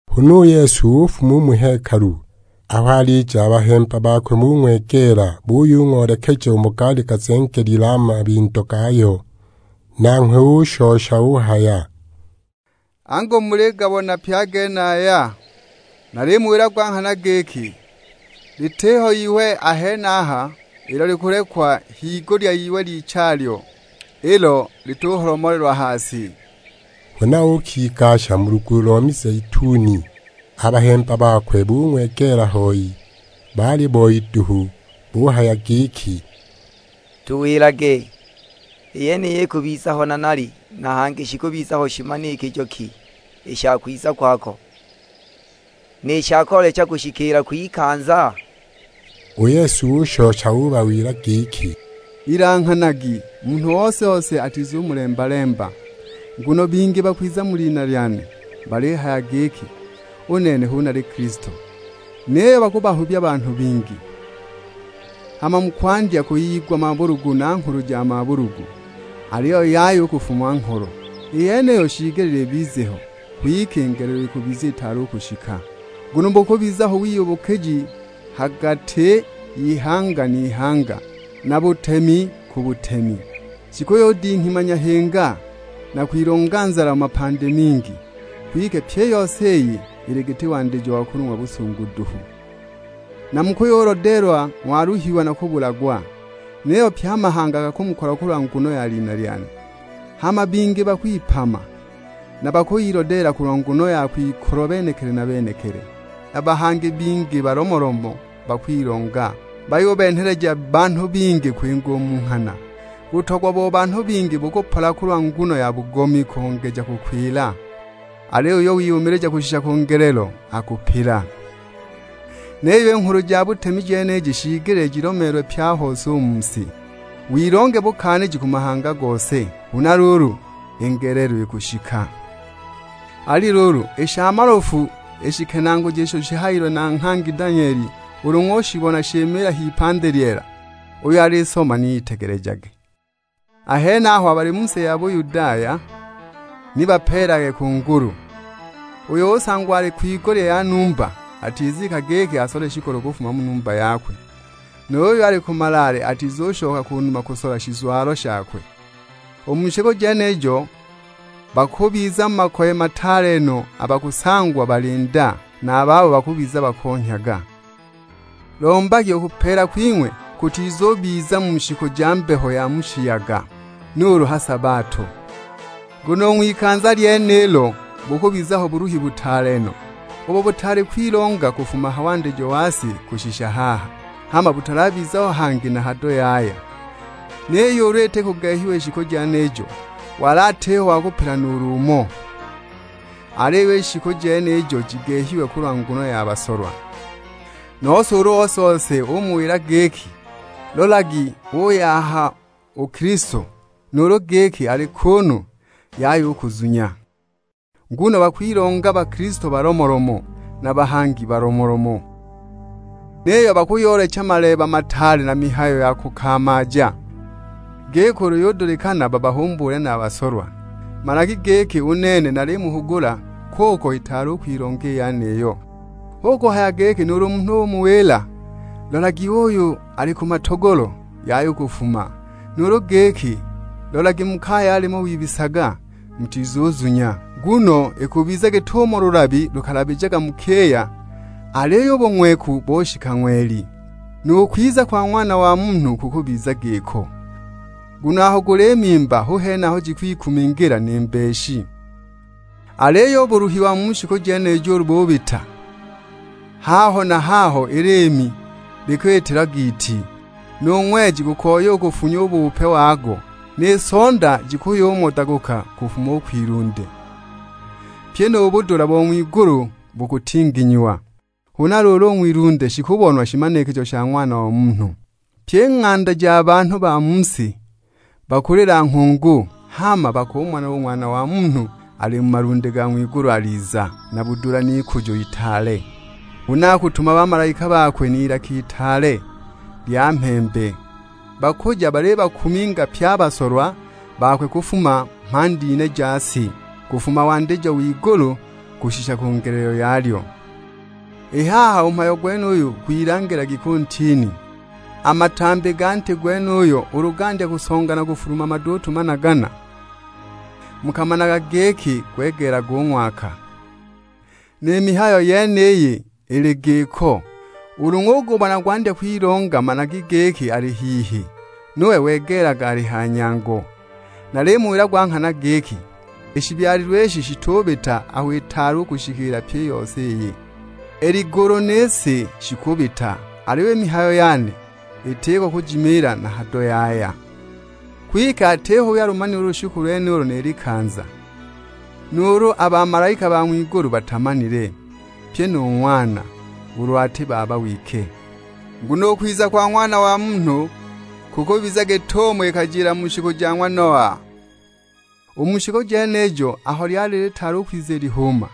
Huna u Yesu ufuma u mu hekalu; aho alija a bahemba bakwe bung'wegeela bayung'oolekeja umo gaali gazengelilwe a mabindo gayo. Nanghwe ushosha uhaya; "Angu muligabona pye a genaya? Nalimuwila gwa nghana giki, litiho iwe a henaha ilo likulekwa higulya y'iwe lichalyo, ilo lituholomolelwa ha si!" Huna uukigasha mu lugulu lo mizeituni, a bahemba bakwe bung'wegeela hoi, bali boi duhu. Buhaya giki, "Tuwilage, i yeniyi ikubiza ho nanali; na hangi shikubiza ho shimanikijo ki i sha kwiza kwako, ni sha koolecha kushikiila kw'ikanza?" U Yesu ushosha ubawila giki, "Ilanghanagi, munhu ose-ose atizumulemba-lemba. Nguno bingi bakuyiza mu lina lyane, balihaya giki, 'U nene hu nali Kilisto!' Niyo bakuhubya banhu bingi. Hama mukwandya kuyigwa mabulugu na nghulu ja mabulugu. Aliyo yaya u kufung'wa ngholo, i yeniyo shiigelile ibize ho; kwike i ngelelo ikubiza itaali u kushika. Nguno bukubiza ho wiyubukiji ha gati y'ihanga n'ihanga, na butemi ku butemi. Jikuyudinghima nyahinga, na kwilonga nzala mu mapandi mingi. Kwike pyi i yeniyi ili giti wandijo wa kulung'wa busungu duhu." "Na mukuyulodeelwa ng'wayuluhiwa na kubulagwa. Niyo pye a mahanga gakumukolwa kulwa nguno ya lina lyane. Hama bingi bakwipama, na bakuyilodeela kulwa nguno ya kwikolwa benekili na benekili. Na bahangi bingi balomolomo bakwilonga, bayubenheleja banhu bingi kwinga u mu nghana. Butogwa bo banhu bingi bukupola kulwa nguno ya bugomi kongeja kukwila. Aliyo uyo wiyumilija kushisha ku ngelelo, akupila. Niyo i Nghulu ja butemi jeniji shiigelile jilomeelwe pye a hose u mu si, wilonge bukaaniji ku mahanga gose; huna luulu i ngelelo ikushika." "Ali luulu, i sha malofu i shikenaaguji isho shihayiwe na nghangi Danyeli ulu ng'ushibona shimiila h'ipandi lyeela, (uyo alisoma ni itegelejage), a henaho abo bali mu si ya Buyudaya ni bapeelelage ku ngulu. Uyo usangwa ali kwigulya ya numba, atizika giki asole shikolo kufuma mu numba yakwe. Nu yuyo ali ku malaale atizushoka ku numa kusola shizwalo shakwe. U mu shiku jenijo bakubiza mu makoye mataale no abo bakusangwa bali nda, na a babo bakubiza bakonhyaga. Lombagi u kupeela kwing'we kutizubiza mu shiku ja mbeho ya mu shiyaga, nuulu ha sabato. Nguno u ng'wikanza lyenilo bukubiza ho buluhi butaale no, ubo butaali kwilonga kufuma ha wandijo wa si kushisha haha; hama butalabiza ho hangi na hado yaya! Niyo ulu ni iti kugehiwa i shiku jenijo, wali atiho wa kupila nuulu umo, aliyo i shiku jenijo jigehiwe kulwa nguno ya basolwa. "Nose ulu ose-ose umuwila giki, 'Lolagi uuy'aha u Kilisto,' nuulu giki, 'Ali kuunu,' yaya u kuzunya. Nguno bakwilonga bakilisto balomolomo, na bahangi balomolomo; niyo bakuyoolecha maleeba mataale na mihayo ya kukamaaja, giki ulu yudulikana babahumbuule na a basolwa. Managi giki u nene nalimuhugula kuko itaali u kwilonga i yeniyo. Hu kuhaya giki nuulu munhu umuwila, 'Lolagi uuyo ali ku matogolo,' yaya u kufuma; nuulu giki, 'Lolagi mu kaya alimo wibisaga,' mutizuzunya. Nguno ikubiza git'umo lulabi lukalabijaga mu kiya, aliyo u bung'weku boshika ng'weli. Nu kwiza kwa Ng'wana wa Munhu kukubiza giko. Nguno aho guli mimba hu hene aho jikwikumingila ni mbeshi." "Aliyo u buluhi wa mu shiku jenijo ulu bubita, haho na haho i liimi likwitilwa giiti, nu ng'weji gukoya u kufunya u bupe wago. Ni sonda jikuyumodaguka kufuma u kwilunde; pyi nu budula bo ng'wigulu bukutinginyiwa. Huna luulu u ng'wilunde shikubonwa shimanikijo sha Ng'wana wa Munhu. Pyi i ng'anda ja banhu ba mu si bakulila nghungu; hama bakumona u Ng'wana wa Munhu ali mu malunde ga ng'wigulu aliza, na budula n'ikujo itaale. Huna akutuma bamalaika bakwe n'ilaka itaale lya mhembe. Bakuja balibakuminga pye a basolwa bakwe kufuma mhandi ine ja si; kufuma wandijo w'igulu kushisha ku ngelelo yalyo!" "I haha u mhayo gwenuyu gwilangilagi ku ntini. A matambi ga nti gwenuyo ulu gandya kusonga na kufuluma maduutu managana, mukamanaga giki gwegeelaga u ng'waka. Ni mihayo yeniyi ili giko; ulu ng'ubona yandya kwilonga managi giki ali hihi, nuwe wegeelaga ali ha nyango. Nalimuwila gwa nghana giki, i shibyalilwe ishi shitubita aho itaali kushikiila pyi i yose iyi. I ligulu ni si shikubita, aliyo i mihayo yane itiko kujimiila na hado yaya!" "Kwike atiho uyo alumanile u lushiku lwenulo ni likanza; nuulu a bamalaika ba ng'wigulu batamanile, pyi nu Ng'wana; ulu ati Baba wike. Nguno u kwiza kwa Ng'wana wa Munhu kukubiza git'umo ikajila mu shiku ja ng'wa Noa. U mu shiku jenijo aho lyali litaali kwiza i lihuuma,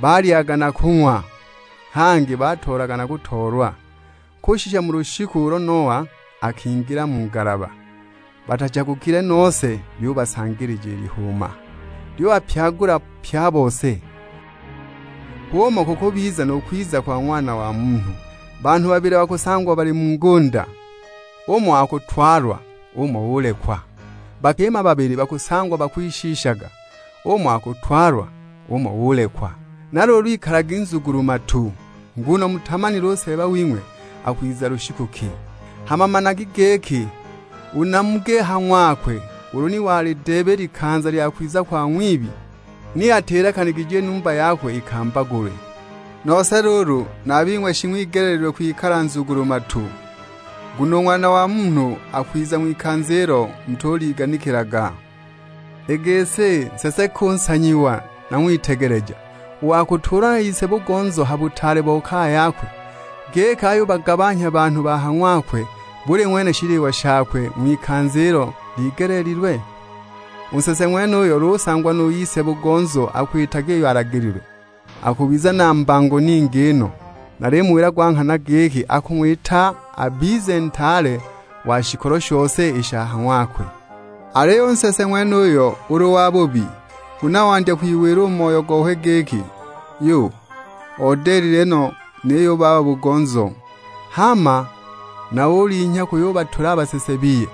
balyaga na kung'wa; hangi batoolaga na kutoolwa, kushisha mu lushiku ulo Noa akingila mu ngalaba. Batachagukile nose lyubasanganija i lihuuma, lyubapyagula pye a bose. H'umo kukubizila nu kwiza kwa Ng'wana wa Munhu! Banhu babili bakusangwa bali mu ngunda, umo akutwalwa, umo ulekwa! Bakima babili bakusangwa bakwishiishaga, umo akutwalwa, umo ulekwa! Na luulu ikalagi nzugulu-matu, nguno mutamanile u Seeba wing'we akwiza lushiku ki. Hama managi giki, u namugi ha ng'wakwe ulu ni walideeba i likanza lya kwiza kwa ng'wibi, ni atilekanigije i numba yakwe ikambagulwe! Nose luulu na a bing'we shing'wigeleelilwe kwikala nzugulu-matu, nguno u Ng'wana wa Munhu akwiza ng'wikanza ilo mutuliganikilaga." "I gisi, nsese ki u nsanyiwa na ng'witegeleja, u wa kutuulwa na ise-bugonzo ha butaale bo kaya yakwe, giki ayubagabanhya banhu ba ha ng'wakwe buli ng'wene shiliwa shakwe ng'wikanza ilo ligeleelilwe? U nsese ng'wenuyo ulu usangwa nu ise-bugonzo akwitaga iyo alagililwe, akubiza na mbango ningi no. Nalimuwila gwa nghana giki akung'wita abize ntaale wa shikolo shose i sha ha ng'wakwe. Aliyo u nsese ng'wenuyo ulu wabubi, huna wandya kwiwila u mu moyo gokwe giki; 'Yu, odilile no niyo u baba-bugonzo!' Hama na ulinhya kuyubatula a basese biye,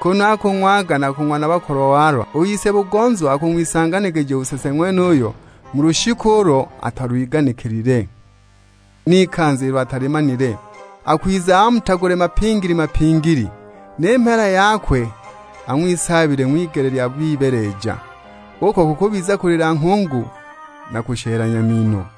kunu akulyaga na kung'wa na bakolwa-walwa, u ise-bugonzo akung'wisanganija u nsese ng'wenuyo mu lushiku ulo atalwiganikilile, n'ikanza ilo atalimanile. Akwiza amutagule mapingili-mapingili, ni mheela yakwe ang'wisaabile ng'wigele lya bibeeleja, uko kukubiza kulila nghungu na kushelanya mino!"